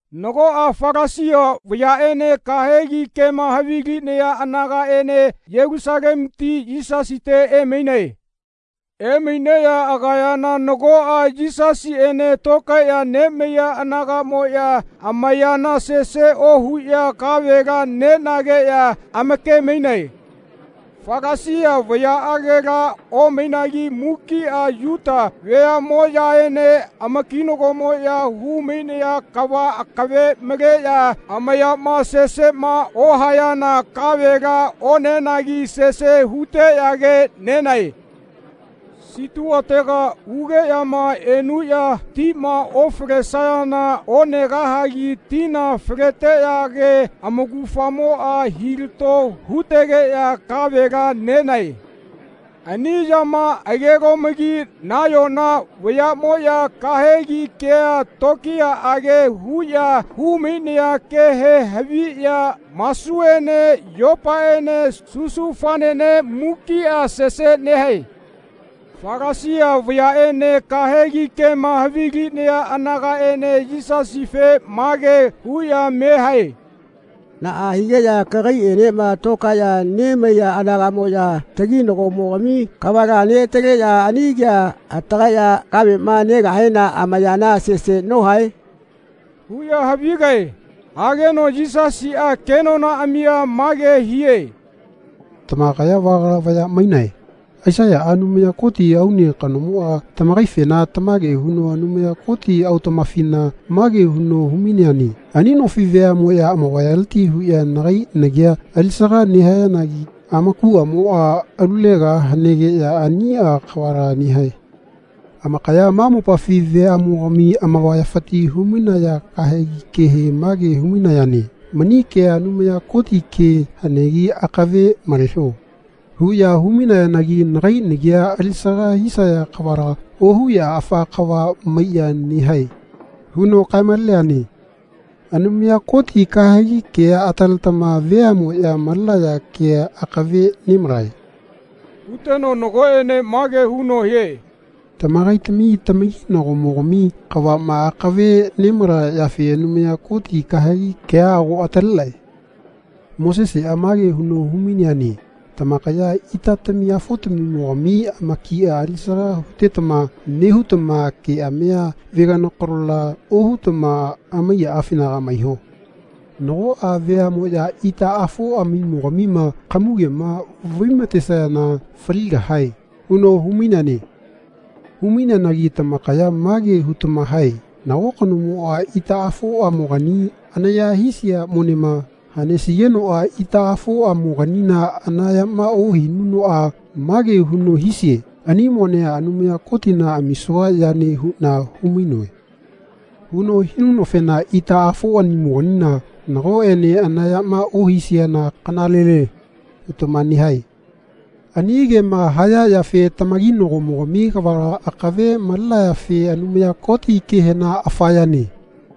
Nagoꞌa Falasia vayaꞌene kahegi kema havilinaya anagaꞌene Yelusalemuti Yisasite emainae. Emaineꞌya agayana nagoꞌa Yisasiꞌene tokaeꞌya nemaiya anagaꞌmoꞌya amayana sese ohuꞌya kavela nenageꞌya amakemainae. Falasia vayaꞌagela omainagi mukiꞌa Yuta veaꞌmoꞌyaene amakinagomoꞌya humainaya kava akave maleꞌya amayama seseꞌma ohayana kavela onenagi sese huteꞌyage nenae. Situatega ugeꞌyama enuꞌya tima ofalesayana onegahagi tina faleteꞌyage amaugafamoꞌa hilato hutegeꞌya kavela nenae. Ani yamaꞌagelomagi nayona vayaꞌmoꞌya kahegi kea tokiyaꞌage huꞌya humainaya kehe haviꞌya masuene yopaene susufanene mukiꞌa sese nehae. Falasia vayaꞌene kahegi kema havilinaya anagaꞌene Yisasife mage huꞌya me hae “Naꞌa higeꞌya kagaiꞌenema tokaeꞌya nemaiya anagaꞌmoꞌya taginagomogami kavala neꞌataleꞌya ani kea atagaeꞌya kaveꞌma negahena amayana sese nohae?” huꞌya havigae. Hageno Yisasiꞌa kenonaꞌamia mage hie “Tamakaya vagala vaya mainae. Aisaiyaꞌa Anumaya Koti aune kanomoꞌa tamakaifena tamage huno Anumaya Koti autaꞌmafina mage huno humaineane ‘Ani nofi veaꞌmoꞌya amavayaleti huꞌya nagai nagia alisaga nehayanagi amakuꞌamoꞌa alulega hanegeꞌya aniꞌa kavala nehae. Amakaya ma mopafi veaꞌmogami amavayafiti humainaya kahegi kehe mage humainayane ‘Mani kea Anumaya Koti ke hanegi akave maleho.’ huꞌya humainayanagi nagai nagia alisaga hisaya kavala ohuꞌya afa kava maiꞌya nehae.’ huno kaemaleneane. Anumaya Koti kahegi kea ataletama veaꞌmoꞌya malenaya kea akave nemalae. Huteno nagoꞌene mage huno hie “Tamakaitami tamakinagomogami kavaꞌma akave nemalaya yafe Anumaya Koti kahegi kea ago atalenae. Moseseꞌa mage huno humaineane ‘Tamakaya itatami afotamimogami amakia alisaga nehutama keꞌamia veganokanola ohutama amaiyaꞌafinaga maiho. Nagoꞌa veaꞌmoꞌya itaꞌafoꞌamimogamima kamugema vaimatesayana faligahae.’ huno humaineane. Humaineanagi tamakaya mage hutama hae ‘Nago kanomoꞌa itaꞌafoꞌamogani anaya hisia monema hanesigenoꞌa itaꞌafoꞌamoganina anayama ohinunoꞌa mage huno hisie ‘Ani monea Anumaya Kotina amisua yane huꞌna humainoe.’ huno hinunofena itaꞌafoꞌamoganina nagoꞌene anayama ohisiana kanalele.’ hutama nehae. Ani kema haya yafe tamakinagomogami kavala akave malenayafe Anumaya Koti kehena ‘Afa yane.’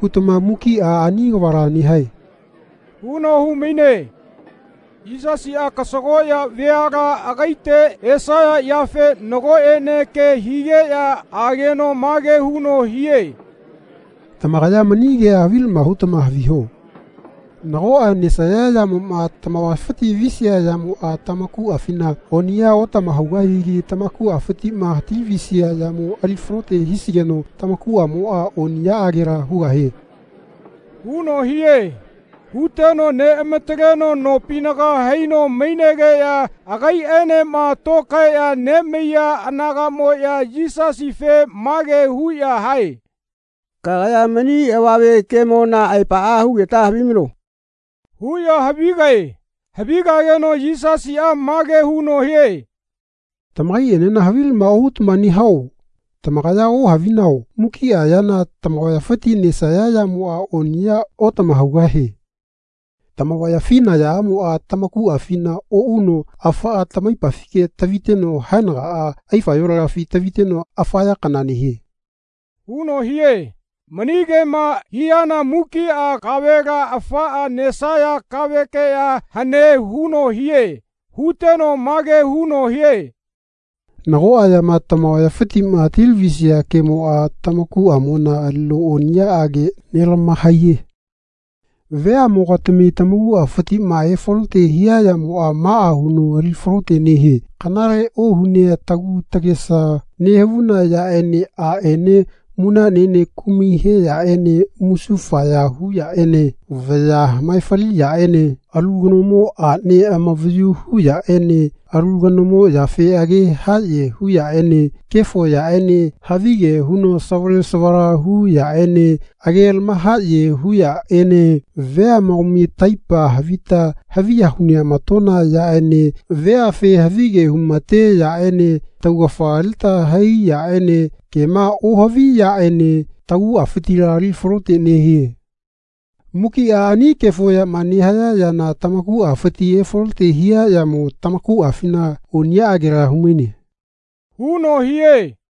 hutama mukiꞌa ani kavala nehae.” huno humaine. Yisasiꞌa kasagoꞌya veala agaite esaya yafe nagoꞌene ke higeꞌya ageno mage huno hie “Tamakaya mani kea havilama hutama haviho. Nagoꞌa nesaya yamoꞌma tamavayafi visia yamoꞌa tamakuꞌafina oniꞌya otamahaugahigi tamakuꞌafitiꞌma hatilavisia yamo ali falote hisigeno tamakuꞌamoꞌa oniꞌyaꞌagela hugahie.” huno hie. Huteno neꞌamataleno nopinaga haino mainegeꞌya agaiꞌaenema tokaeꞌya nemaiya anagaꞌmoꞌya Yisasife mage huꞌya hae “Kagaya mani avame kemona aepaꞌa hugeta havimano.” huꞌya havigae. Havigageno Yisasiꞌa mage huno hie “Tamakaiꞌenena havilama ohutama nehao? Tamakaya ohavinao mukiꞌa yana tamavayafima nesaya yamoꞌa oniꞌya otamahaugahie. Tamavayafi nayaꞌamoꞌa tamakuꞌafina oꞌuno afaꞌa tamaipafike taviteno haenagaꞌa aifayolagafina taviteno afa ya kana nehie.” huno hie. Mani kema hiana mukiꞌa kavela afaꞌa nesaya kavekeꞌya hane huno hie. Huteno mage huno hie “Nagoꞌa yama tamavayafitiꞌma hatilavisia kemoꞌa tamakuꞌamona alino oniꞌyaꞌage nelamahaiye. Veaꞌmogati taguꞌafitiꞌma efalote hia yamoꞌa maꞌa huno ali falote nehie kanale ohunea tagu tagesa nehavuna yaꞌene aꞌne munaꞌnene kumai he yaꞌene musufaya hu yaꞌene vaya hamaefali yaꞌene alu kanomo aꞌne amavayu hu yaꞌene alu kanomo yafe age haꞌye hu yaꞌene kefo yaꞌene havige huno savale savala hu yaꞌene age lamahaꞌye nehaya yaꞌene veamogami taipa havita haviya huneꞌamatona yaꞌene veafe havige humate yaꞌene taugafa alita hai yaꞌene kema ohavi yaꞌene taguꞌafitila ali falote nehie. Mukiꞌa ani kefo yama nehaya yana tamakuꞌafiti efalote hia yamo tamakuꞌafina oniꞌyaꞌagela humaine.” huno hie.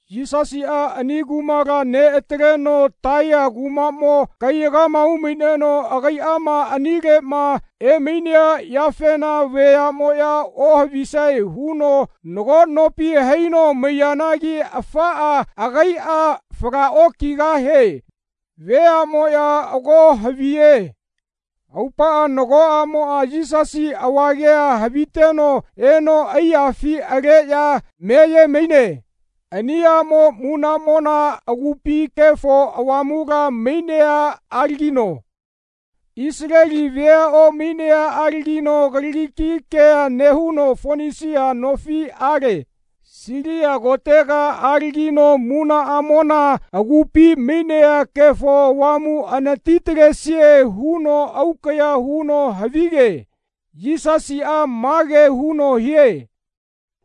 Yisasiꞌa ani kumala neꞌataleno Taiya kumaꞌmo kaiyaga umaineno agaiꞌama anileꞌma emainea yafena veaꞌmoꞌya ohavisae huno nago nopi haino maiyanagi afaꞌa agaiꞌa falaꞌokigahie. Veaꞌmoꞌya ago haviye. Aupaꞌa nago aꞌmoꞌa Yisasi avagea haviteno eno aiyafi aleꞌya meyemaine. Ani aꞌmo munaꞌmona agupi Kefo Avamula mainea alagino. Isaleli vea omainea alagino Kaliki ke nehuno Fonisia nofi ale. Silia kotega alagino munaꞌamona agupi mainea Kefo Avamu anatitalesie huno aukaꞌya huno havige. Yisasiꞌa mage huno hie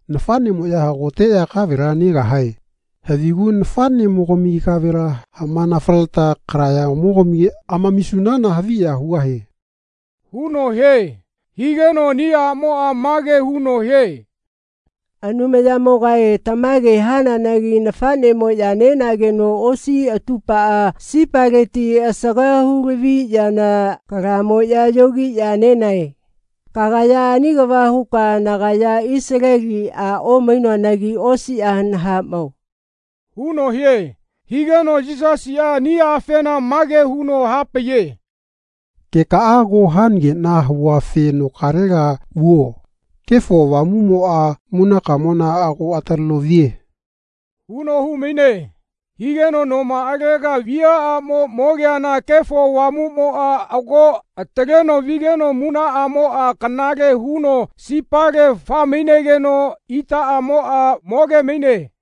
“Nafaꞌnemoꞌya hagoteꞌya kavela negahae. Havigu nafaꞌnemogami kavela hamanafaleta kalayagamogami amamisunana haviya hugahie.” huno hie. Higeno ani aꞌmoꞌa mage huno hie “Anumayamogae tamage hananagi nafaꞌnemoꞌya nenageno osi atupaꞌa sipaleti asaga hulavia yana kalamoꞌya yogiꞌya nenae. Kagaya ani kava huka nagaya Isaleli a omainoanagi osiꞌa nahaꞌmao.” huno hie. Higeno Yisasiꞌa ani afena mage huno hapaiye “Kekaꞌa ago hanageꞌna havuafe nokalega vuo. Kefo Avamuꞌmoꞌa munakamona ago ataleno vie.” huno humaine. Higeno nomaꞌalega viaꞌamo mogeana Kefo Avamuꞌmoꞌa ago ataleno vigeno munaꞌamoꞌa kanale huno sipale faemainegeno itaꞌamoꞌa mogemaine.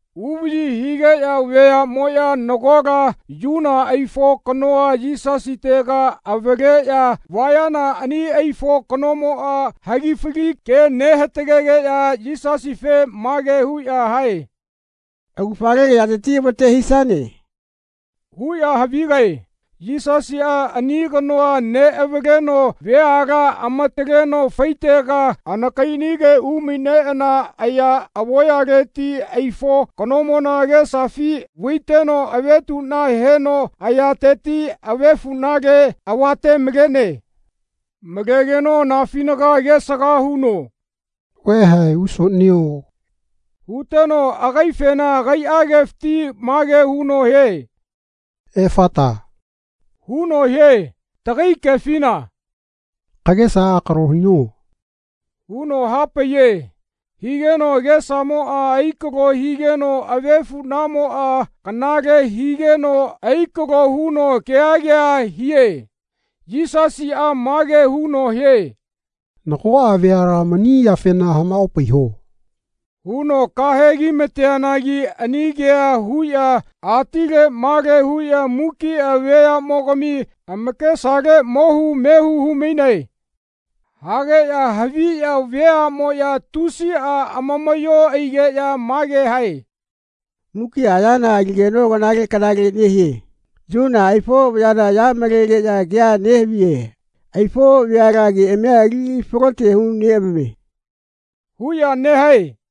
Uvaꞌyi higeꞌya veaꞌmoꞌya nagola yuna aifo kanoa Yisasitega avaleꞌya vayana ani aifo kanomoꞌa hagifali ke nehatagegeꞌya Yisasife mage huꞌya hae “Augafale kayateti avate hisane.” huꞌya havigae. Yisasiꞌa ani kanoa neꞌavaleno veala amataleno faitega anakaiꞌanige umaineꞌana aya avoyaleti aifo kanomona agesafi vaiteno avetuꞌna heno ayateti avefuꞌnale avatemalene. Malegeno anafinaga agesaga huno “Vaeha ausoꞌnio.” huteno agaifena agaiꞌa kefiti mage huno hie “Efata.” huno hie. Tagai kefina “Kagesa akalo hino.” huno hapaiye. Higeno agesamoꞌa akalo higeno avefuꞌnamoꞌa kanale higeno aikalo huno kea kea hie. Yisasiꞌa mage huno hie “Nagoꞌa veala mani yafena hamaꞌopaiho.” huno kahegi mateanagi ani kea huꞌya atile male huꞌya mukiꞌa veaꞌmogami amakesale mohu mehu humainae. Hageꞌya haviya veaꞌmoꞌya tusiꞌa amamaꞌyo aigeꞌya mage hae “Mukiꞌa yana aligeno kanale kanale nehie. Yuna aifo vayala aya malegeꞌya kea nehaviye. Aifo vayala keꞌamia ali falote huneꞌamamie.” huꞌya nehae.